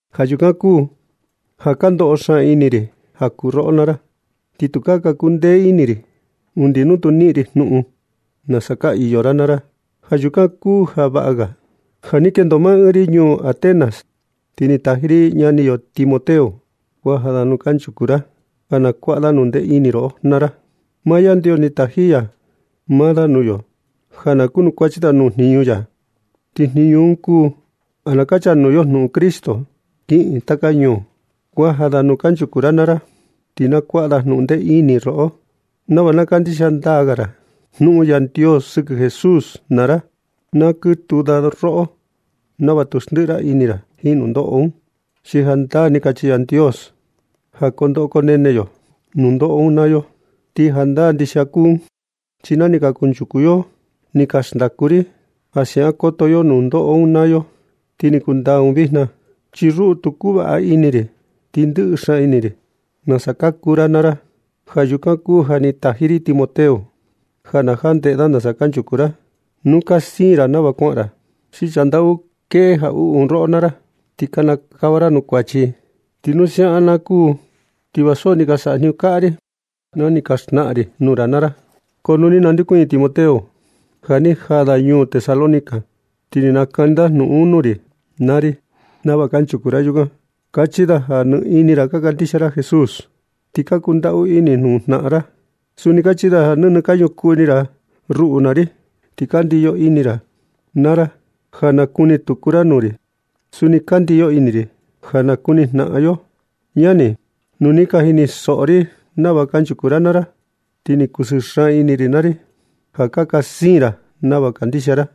Ja yukan kuu ja ka ndoꞌo xaan ini ri ja kuu roꞌo naa ra. Ti tukaa ka kundee ini ri undi nu tu niꞌin ri jnuꞌun nasa ka iyo ra naa ra. Ja yukan kuu ja vaꞌa ga ja ni kendo maa ɨɨn ri ñuu Atenas, ti ni taji ri ñani yo Timoteo kuaja da nuu kanchuku ra ja na kuaꞌa da jnundee ini roꞌo naa ra. Maa Yandios ni taji ya maa da nuu yo ja na kunukuachi da nuu jniñu ya. Ti jniñu un kuu ja na kachanuu yo jnuꞌun Cristo kiꞌin taka ñuu. Kuaja da nuu kanchuku ra naa ra, ti na kuaꞌa da jnundee ini roꞌo nava na kandixia ndaa ga ra jnuꞌun Yandios sɨkɨ Jesús naa ra. Na kɨtuu da roꞌo nava tu xndiꞌi ra ini ra jiin nundoꞌo un, chi jandaa ni kachi Yandios ja koo ndoꞌo koo nene yo nundoꞌo un naa yo. Ti jandaa ndixia kuu un, chi na ni ka kunchuku yo ni ka xndaku ri ja siaꞌan koto yo nundoꞌo un naa yo, ti ni kundaa un vijna. Chi ruꞌu, tu kuu vaꞌa ini ri, ti ndɨꞌɨ xaan ini ri nasa ka kuu ra naa ra. Ja yukan kuu ja ni taji ri Timoteo ja na jandeꞌe da nasa kanchuku ra, nu ka siin ra nava kuaꞌan ra, chi sandau kueꞌe jaꞌuꞌu un roꞌo naa ra, ti kinikava ra nuu kuachi. Chi nu siaꞌan na kuu, ti va so ni ka saꞌa jniñu kaꞌa ri na ni xnaꞌan ri nuu ra naa ra. Ko nu ni nandeokuñɨ Timoteo ja ni jaa da ñuu Tesalónica, ti ni nakani da jnuꞌun nuu ri naa ri nava kanchuku ra yukan. Kachi da ja nɨ ini ra ka kandixia ra Jesús, ti ka kundaꞌu ini nuu jnaꞌan ra. Suni kachi da ja nɨnɨ ka ñukuu ini ra ruꞌu naa ri, ti ka ndiyo ini ra naa ra ja na kuni tuku ra nuu ri. Suni ka ndiyo ini ri ja na nakuni jnaꞌan yo. Ñani, nu ni ka jinisoꞌo ri nava kanchuku ra naa ra, ti ni ka kusɨɨ xaan ini ri naa ri ja ka siin ra nava ka kandixia ra.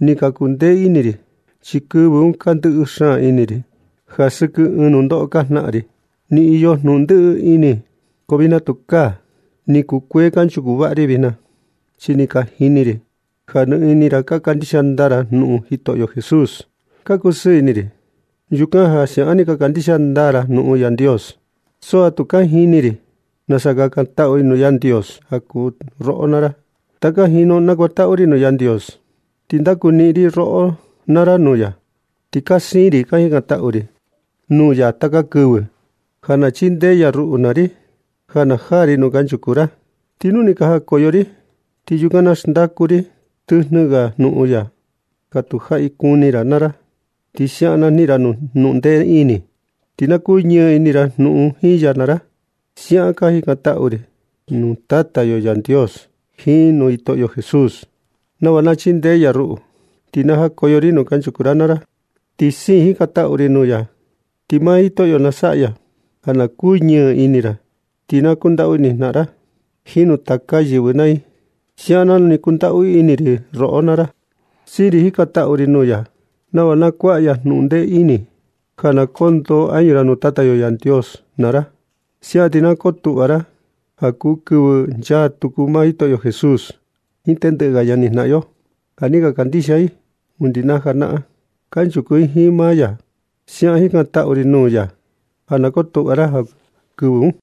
Ni ka kuu ndee ini ri, chi kɨvɨ un ka ndɨꞌɨ xaan ini ri ja sɨkɨ ɨɨn nundoꞌo ka janaꞌan ri. Ni iyo jnuꞌun ndɨꞌɨ ini, ko vijna tukaa. Ni kukuee kanchuku vaꞌa ri vijna, chi ni ka jini ri ja nɨ ini ra ka kandixia ndaa ra jnuꞌun Jitoꞌo Jesús. Ka kusɨɨ ini ri yukan ja siaꞌan ni ka kandixia ndaa ra jnuꞌun Yandios, so ja tu ka jini ri nasa kakantaꞌu ri nuu Yandios ja kuu roꞌo naa ra. Ti taka jinu nakuantaꞌu ri nuu Yandios ti ndakuniꞌin ri roꞌo naa ra nuu ya. Ti ka siin ri ka jikantaꞌu ri nuu ya taka kɨvɨ ja na chindee ya ruꞌu naa ri, ja na jaa ri nuu kanchuku ra. Ti nu ni ka jakoyo ri, ti yukan na xndaku ri tɨjnɨ ga jnuꞌun ya, ja tu jaꞌi kuni ra naa ra. Ti siaꞌan na niꞌin ra jnundee ini, ti na kuñɨɨ ini ra jiin jnuꞌun ya naa ra. Siaꞌan ka jikantaꞌu ri nuu Tata yo Yandios jiin nuu Jitoꞌo Jesús, nava na chindee ya ruꞌu, ti na jakoyo ri nuu kanchuku ra naa ra. Ti siin jikantaꞌu ri nuu ya, ti maa Jitoꞌo na saꞌa ya ja na kuñɨɨ ini ra. Ti na kundaꞌu ini nuu jnaꞌan ra jiin nuu taka ga yɨvɨ naa i, siaꞌan nanu ka kundaꞌu ini ri roꞌo naa ra. Siin ri jikantaꞌu ri nuu ya nava na kuaꞌa ya jnundee ini, ja na kondoo añu ra nuu Tata yo Yandios naa ra. Siaꞌan ti na kotuꞌva ra ja kuu kɨvɨ nchaa tuku Jitoꞌo Jesús jiin tendɨꞌɨ ga ñanijnaꞌan yo, ja ni ka kandixia i undi na janaꞌan, ti kanchuku i jiin maa ya. Siaꞌan jikantaꞌu ri nuu ya, ja na kotuꞌva ra ja kuu kɨvɨ un.